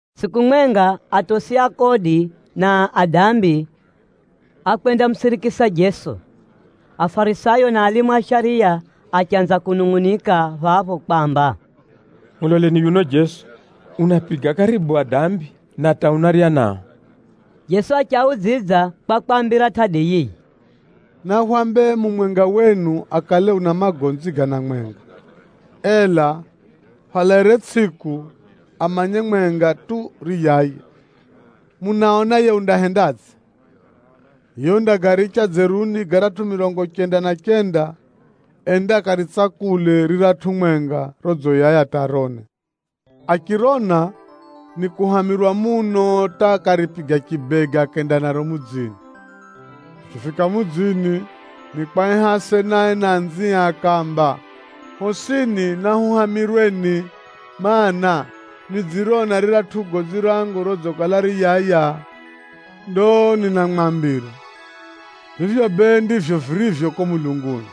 Tsʼiku mwenga, atosi a kodi na adambi ákwendamusirikisa Jeso. Afarisayo na alimu a shariya achanza kunungʼunika phapho kwamba, “Muloleni yuno Jeso! Unaapiga karibu adambi, na hata unarya nao.” Jeso achiaudzidza kwa kwaambira tʼadi yiyi: “Nahwambe mumwenga wenu akale una magonzi gana mwenga, ela phalairire tsʼiku amanye mwenga tu riyaya, munaona yiye undahendadze? Yiye undagaricha dzeruni garatʼu mirongo chenda na chenda ende akaritsakule riratʼu mwenga rodziyaya hata arone. Achirona, nikuhamirwa muno hata akaripiga chibega akenda naro mudzini. Achifika mudzini, nikwaiha asenae na anzie akaamba, ‘Hosini nahuhamirweni, mana, nidzirona riratʼu gonzi rangu rodzikala riyaya.’ Ndo ninamwambira, vivyo bee ndivyo virivyo kuko mulunguni.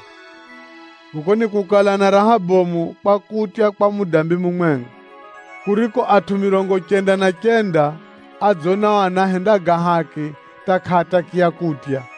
Kuko nikukala na raha bomu kwa kutya kwa mudambi mumwenga, kuriko atʼu mirongo chenda na chenda adzonao anahenda ga haki hata kʼaatakiya kutya.”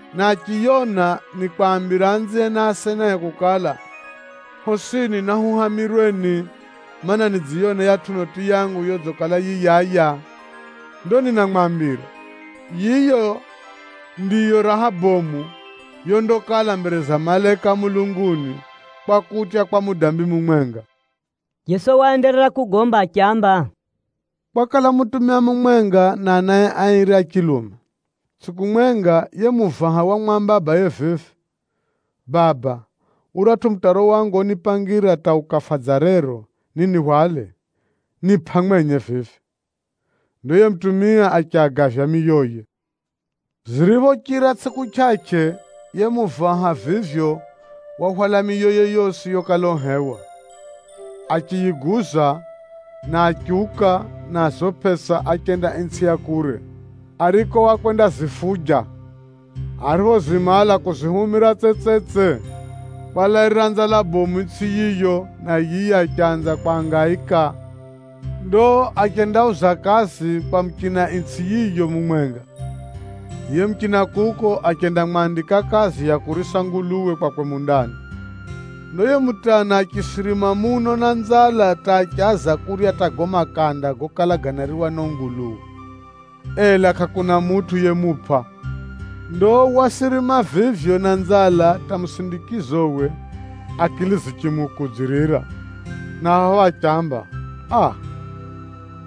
Na achiyona, nikwambira anzie na asenae kukala, ‘Hosini nahuhamirweni, mana, nidziyona yiyatʼu noti yangu yodzikala yiyaya.’ Ndo ninamwambira, yiyo ndiyo raha bomu yondakala mbere za malaika a mulunguni, kwa kutya kwa mudambi mumwenga.” Jeso waenderera kugomba achiamba, “Kwakala mutumia mumwenga na anae airi a chilume. Tsʼiku mwenga, yiye muvaha wamwamba abaye vivi, ‘Baba, uratʼu mutaro wangu onipangira hata ukafa dza rero ninihwale, nipʼa mwenye vivi.’ Ndo yiye mutumia achiagavya miyoye. Ziriphochira tsʼiku chʼachʼe, yiye muvaha vivyo wahwala miyoye yosi yokala uhewa, achiyiguza, na achiuka na zo pʼesa achenda itsʼi ya kure, ariko wakwendazifuja. Ariphozimala kuzihumira tsetsetse, kwalairira nzala bomu itsʼi yiyo na yiye achanza kwangaika. Ndo achendauza kazi kwa muchina itsʼi yiyo mumwenga. Yiye muchina kuko achendamwandika kazi ya kurisa nguluwe kwakwe mundani. Ndo yiye mutana achisirima muno na nzala hata achaza kurya hata gago makanda gokala ganariwa ni o nguluwe, ela kʼakuna mutʼu yemupʼa. Ndo wasirima vivyo na nzala hata musindikizowe akili zichimukudzirira, na phapho achiamba, ‘Aa!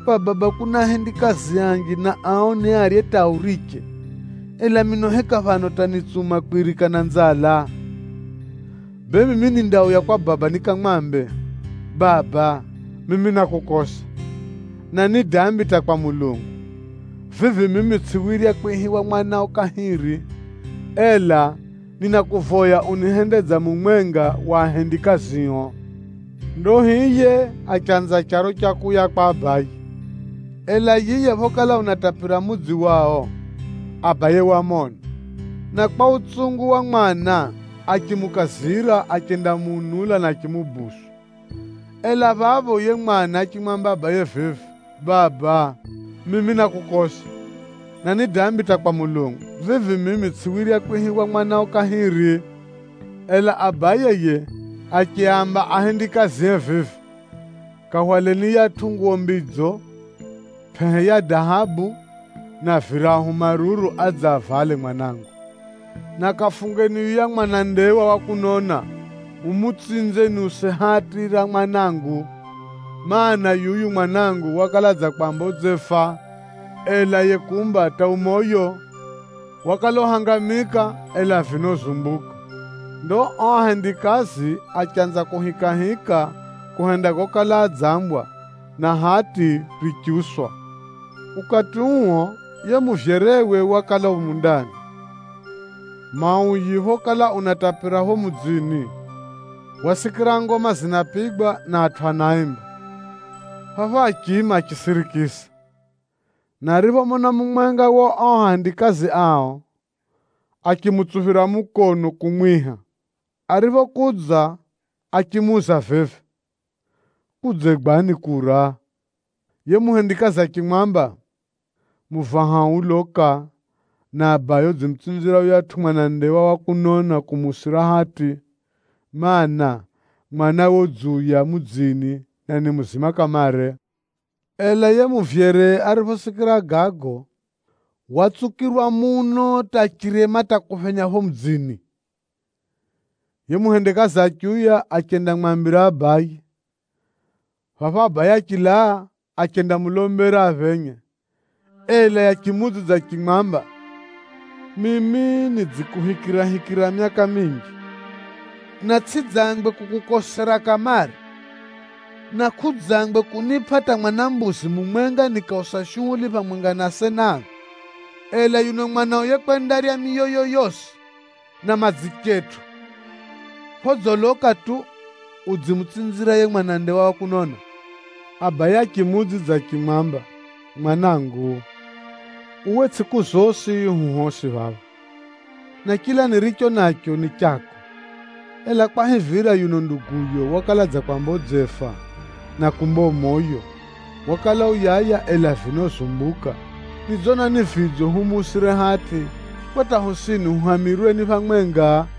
Kwa baba kuna ahendikazi anji na ao niarye hata auriche, ela mino heka phano hata nitsuma kwirika na nzala? Bee, mimi nindauya kwa baba nikamwambe, “Baba, mimi nákukosa, na ni dambi hata kwa Mulungu. Vivi mimi tsʼiwirya kwihiwa mwanao kahiri. Ela ninakuvoya unihende dza mumwenga wa ahendikazio.” ’ Ndo hiye achanza charo cha kuuya kwa abaye. Ela yiye phokala unatapira mudzi wao, abaye wamona, na kwa utsungu wa mwana, achimukazira achendamuunula, na achimudonera. “Ela phapho, yiye mwana achimwamba abaye vivi, ‘Baba, mimi nákukosa, na ni dambi hata kwa Mulungu. Vivi mimi tsʼiwirya kwihiwa mwanao kahiri.’ Ela abaye yiye achiaamba ahendikazie vivi, ‘Kahwaleni yiyatʼu nguwo mbidzo, pʼehe ya dahabu na virahu maruru adze avale mwanangu! Na kafungeni yuya mwanandewa wa kunona mumutsinze niuse hati ra mwanangu! Maana, yuyu mwanangu wakala dza kwamba udzefa, ela yiye kumba hata u moyo, wakala uhangamika, ela vino uzumbuka.’ Ndo o ahendikazi achanza kuhikahika kuhenda gokala adzambwa, na hati richiuswa. “Ukati uo, yiye muvyerewe wakala u mundani. Mauyi phokala unatapira pho mudzini, wasikira ngoma zinapigwa na atʼu anaimba. Phapho achiima achisirikisa, na ariphomona mumwenga wa o ahendikazi ao, achimutsuphira mukono kumwiha. Ariphokudza achimuuza vivi, ‘Kudzegwani kura?’ Yiye muhendikazi achimwamba, ‘Muvahao uloka, na abayo udzimutsinzira yuyatʼu mwanandewa wa kunona kumuusira hati, mana, mwanawe udziuya mudzini na ni muzima kamare.’ Ela yiye muvyere ariphosikira gago, watsukirwa muno hata achirema hata kuphenya pho mudzini. Yiye muhendikazi achiuya achendamwambira abaye. Phapho abaye achilaa, achendamulombera aphenye, ela yiye achimuudzidza achimwamba, ‘Mimi nidzikuhikirahikira myaka minji, na tsʼidzangwe kukukosera kamare, na kʼudzangwe kunipʼa hata mwana mbuzi mumwenga nikausa shuhuli phamwenga na asena angu! Ela yuno mwanao yekwendarya miyoyo yosi na madzichetʼu phodziloka tu, udzimutsinzira yiye mwanandewa wa kunona!’ Abaye achimuudzidza achimwamba, ‘Mwanangu, uwe tsʼiku zosi hu hosi phapha, na chila niricho nacho ni chako. Ela kwahivira yuno nduguyo wakala dza kwamba udzefa, na kumba u moyo, wakala uyaya, ela vino uzumbuka, nidzona ni vidzo humuusire hati, kwa hata hosini huhamirweni phamwenga.’”